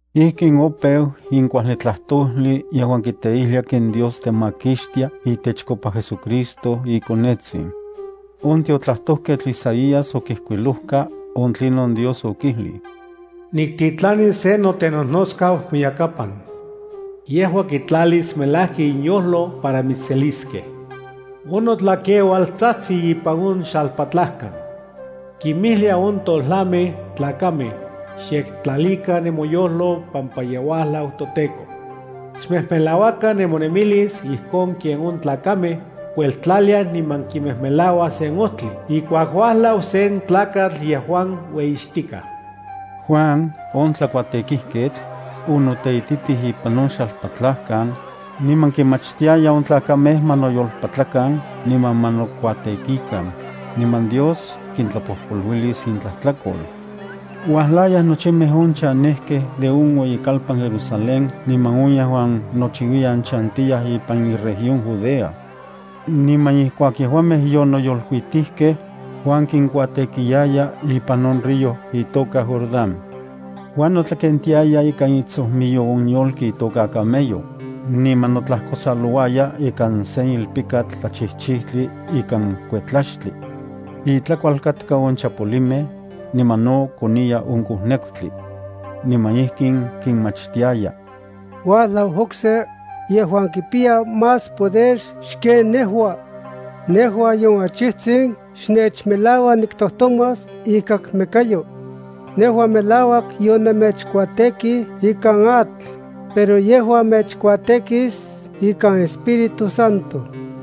Ijkin opeu in kuajli tlajtojli yejuan kiteijlia ken Dios temakixtia itechkopa JesuCristo iKonetsin. On tiotlajtojketl Isaías okijkuilojka on tlinon Dios okijlij: Niktitlanis sen notenojnotskau moyakapan. Yejua kitlalis melajki inyojlo para mitsseliskej. On notlakeual tsajtsi ipan on xalpatlajkan. Kinmijlia on tojlamej tlakamej: “Xyektlalikan nemoyojlo pampa ye uajlau toTEKO. Xmejmelauakan nemonemilis ijkon ken on tlakamej kueltlaliaj niman kimejmelauaj sen ojtli ijkuak uajlau sen tlakatl yejuan ueyixtikaj.” Juan, on tlakuatekijketl, onoteititij ipan on xalpatlajkan, niman kinmachtiayaj on tlakamej ma noyolpatlakan niman ma nokuatekikan, niman Dios kintlapojpoluilis intlajtlakol. Uajlayaj nochimej on chanejkej de on ueyikalpan Jerusalén niman on yejuan nochiuiyan chantiyaj ipan iregión Judea. Niman ijkuak yejuamej yonoyolkuitijkej, Juan kinkuatekiyaya ipan on río itoka Jordán. Juan notlakentiaya ikan itsojmiyo on yolki itoka camello, niman notlajkosalouaya ikan sen ilpikatl tlachijchijtli ikan kuetlaxtli. Itlakual katka on chapolimej, niman no koniya on kojnekutli. Niman ijkin kinmachtiaya: —Uajlau okse, yejuan kipiya más poder xken nejua. Nejua nion achijtsin xnechmelaua niktojtomas ikakmekayo. Nejua melauak yonemechkuatekij ikan atl, pero yejua mechkuatekis ikan Espíritu Santo.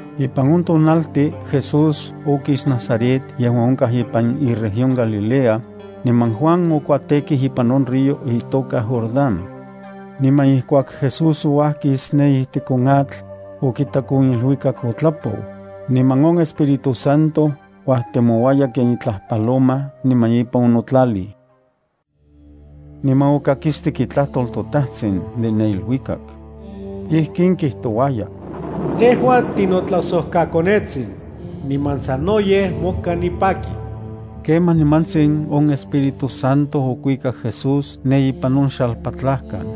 Ipan on tonaltin Jesús okis Nazaret yejuan onkaj ipan iregión Galilea, niman Juan okuatekij ipan on río itoka Jordán. Niman ijkuak Jesús ouajkis ne ijtik on atl, okitak on iluikak otlapou, niman on Espíritu Santo uajtemouaya ken itlaj paloma niman ipan onotlalij. Niman okakistik itlajtol toTajtsin de ne iluikak. Ijkin kijtouaya: —Tejua tinotlajsojkaKonetsin, niman sanoyej moka nipaki. Kemaj nimantsin on Espíritu Santo okuikak Jesús ne ipan on xalpatlajkan.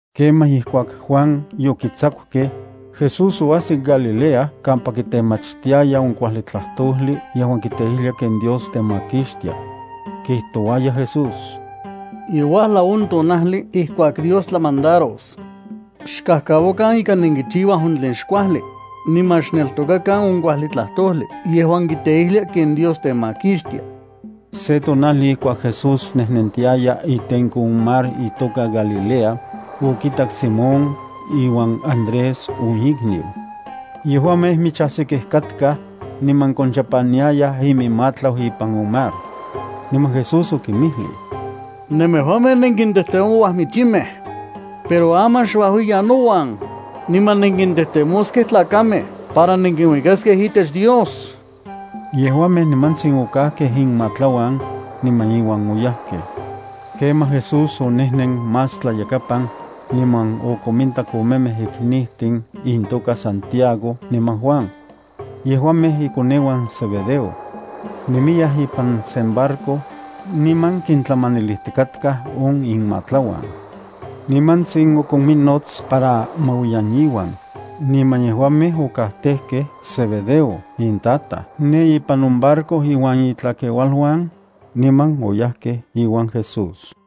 Kemaj ijkuak Juan yokitsakukej, Jesús oajsik Galilea kampa kitemachtiaya on kuajli tlajtojli yejuan kiteijlia ken Dios temakixtia. Kijtouaya Jesús: —Ye uajlau on tonajli ijkuak Dios tlamandaros. Xkajkauakan ika nenkichiuaj on tlen xkuajli, niman xneltokakan on kuajli tlajtojli yejuan kiteijlia ken Dios temakixtia. Se tonajli ijkuak Jesús nejnentiaya itenko on mar itoka Galilea, okitak Simón iuan Andrés on ikniu. Yejuamej michajsikej katkaj, niman konchapaniayaj iminmatlau ipan on mar. Niman Jesús okinmijlij: —Nemejuamej nenkintejtemouaj michimej. Pero aman xuajuiyan nouan, niman nenkintejtemoskej tlakamej para nenkinuikaskej itech Dios. Yejuamej nimantsin okajkej inmatlauan, niman iuan oyajkej. Kemaj Jesús onejnen más tlayakapan, niman okomintak omemej iknijtin intoka Santiago niman Juan. Yejuamej ikoneuan Zebedeo. Nemiyaj ipan sen barco, niman kintlamanilijtikatkaj on inmatlauan. Nimantsin okominnots para ma uajuiyan iuan, niman yejuamej okajtejkej Zebedeo intataj ne ipan on barco inuan itlakeualuan, niman oyajkej iuan Jesús.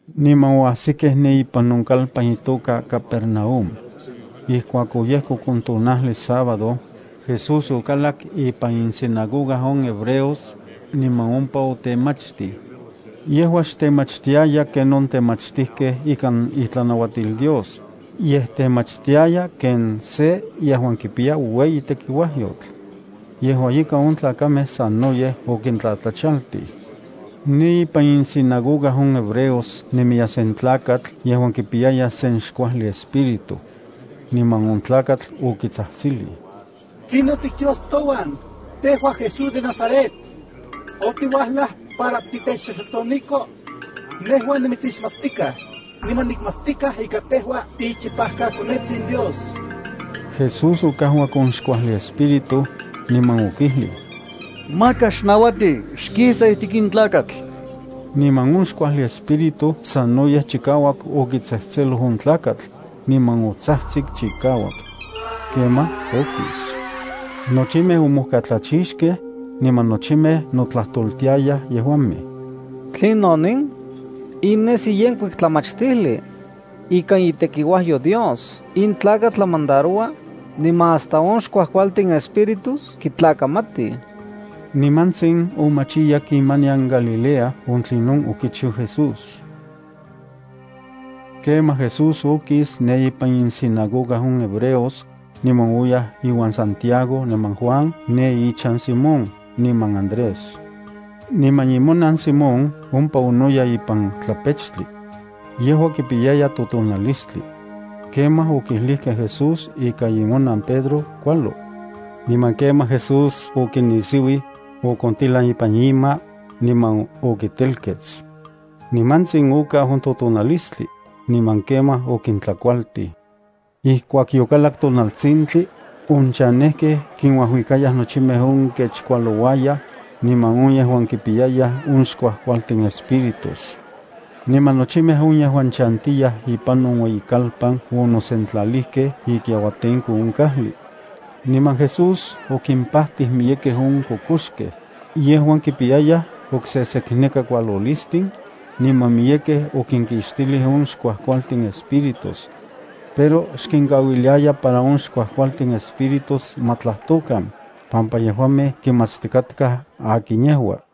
Niman oajsikej ne ipan on kalpan itoka Capernaúm. Ijkuak oyejkok on tonajli sábado, Jesús okalak ipan insinagoga on hebreos, niman ompa otemachtij. Yejua xtemachtiaya ken on temachtijkej ikan itlanauatil Dios, yej temachtiaya ken se yejuan kipiya ueyi tekiuajyotl. Yejua ika on tlakamej sanoyej okintlajtlachaltij. Ne ipan insinagoga on hebreos nemiya sen tlakatl yejuan kipiyaya sen xkuajli espíritu. Niman on tlakatl okitsajtsilij: —¿Tlinon tikchiuas touan, tejua Jesús de Nazaret? ¿Otiuajlaj para titechxoxotoniko? Nejua nimitsixmatstikaj, niman nikmatstikaj ika tejua tiichipajkaKonetsin Dios. Jesús okajuak on xkuajli espíritu, niman okijlij: —¡Maka xnauati! ¡Xkisa ijtik in tlakatl! Niman on xkuajli espíritu sanoyej chikauak okitsejtseloj on tlakatl, niman otsajtsik chikauak. Kemaj okis. Nochimej omojkatlachixkej, niman nochimej notlajtoltiayaj yejuamej: —¿Tlinon in? In nesi yenkuik tlamachtijli. Ikan itekiuajyo Dios in tlakatl tlamandaroua, niman hasta on xkuajkualtin espíritus kitlakamatij. Nimantsin omachiyak imanian Galilea on tlinon okichiu Jesús. Kemaj Jesús okis ne ipan insinagoga on hebreos, niman oyaj iuan Santiago niman Juan ne inchan Simón niman Andrés. Niman imonan Simón ompa onoya ipan tlapechtli. Yejua kipiyaya totonalistli. Kemaj okijlijkej Jesús ika imonan Pedro kualo. Niman kemaj Jesús okinisiuij, okontilan ipan ima, niman okitelkets. Nimantsin okau on totonalistli, niman kemaj okintlakualtij. Ijkuak yokalak tonaltsintli, on chanejkej kinuajuikayaj nochimej on kech kualouayaj, niman on yejuan kipiyayaj on xkuajkualtin espíritus. Niman nochimej on yejuan chantiyaj ipan on ueyikalpan onosentlalijkej ikiauatenko on kajli. Niman Jesús okimpajtij miyekej on kokoxkej, yejuan kipiyayaj oksesekneka kualolistin, niman miyekej okinkixtilij on xkuajkualtin espíritus. Pero xkinkauiliaya para on xkuajkualtin espíritus ma tlajtokan, pampa yejuamej kimatstikatkaj akin yejua.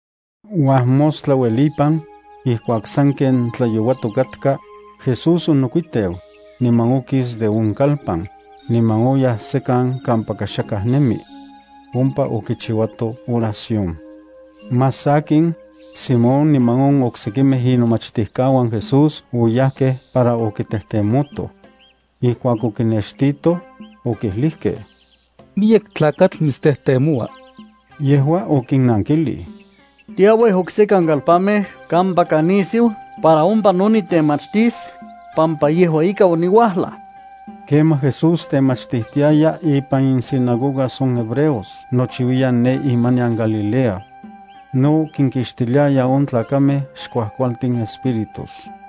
Uajmostla uelipan, ijkuak sanken tlayouatok katka, Jesús onokuiteu, niman okis de on kalpan, niman oyaj sekan kampaka xakaj nemi. Ompa okichiuato oración. Más sakin, Simón niman on oksekimej inomachtijkauan Jesús oyajkej para okitejtemotoj. Ijkuak okinextitoj, okijlijkej: —Miyek tlakatl mitstejtemoua. Yejua okinnankijlij: —Tiauij oksekan kalpanmej kampaka nisiu para ompa no nitemachtis, pampa yejua ika oniuajlaj. Kemaj Jesús temachtijtiaya ipan insinagogas on hebreos nochiuiyan ne imanian Galilea. No kinkixtiliaya on tlakamej xkuajkualtin espíritus.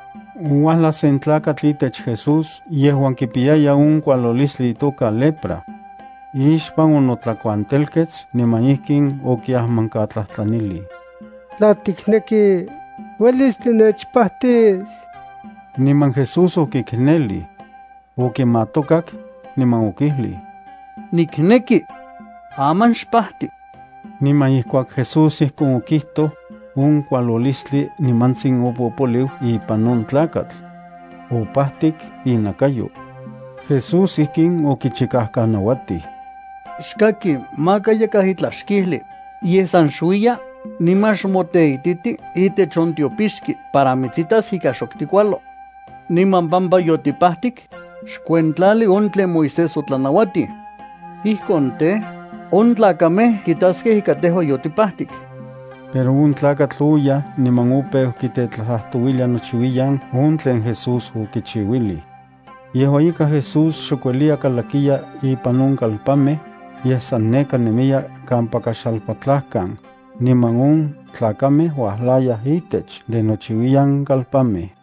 Ouajlaj sen tlakatl itech Jesús yejuan kipiyaya on kualolistli itoka lepra. Ixpan onotlakuantelkets niman ijkin okiajmankatlajtlanilij: —Tla tikneki, uelis tinechpajtis. Niman Jesús okiknelij. Okimatokak, niman okijlij: —Nikneki. Aman xpajti. Niman ijkuak Jesús ijkon okijtoj, on kualolistli nimantsin opopoliu ipan on tlakatl. Opajtik inakayo. Jesús ijkin okichikajkanauatij: —Xkaki, maka yakaj itlaj xkijli, yej san xuiya, niman xmoteititi itech on tiopixki para mitsitas ika xok tikualo. Niman pampa yotipajtik, xkuentlali on tlen Moisés otlanauatij. Ijkon tej, on tlakamej kitaskej ika tejua yotipajtik. Pero on tlakatl oyaj niman opeu kitetlajtlajtouilia nochiuiyan on tlen Jesús okichiuilij. Yejua ika Jesús xok ueliya kalakiya ipan on kalpanmej, yej san nekaj nemiya kampaka xalpatlajkan, niman on tlakamej uajlayaj itech de nochiuiyan kalpanmej.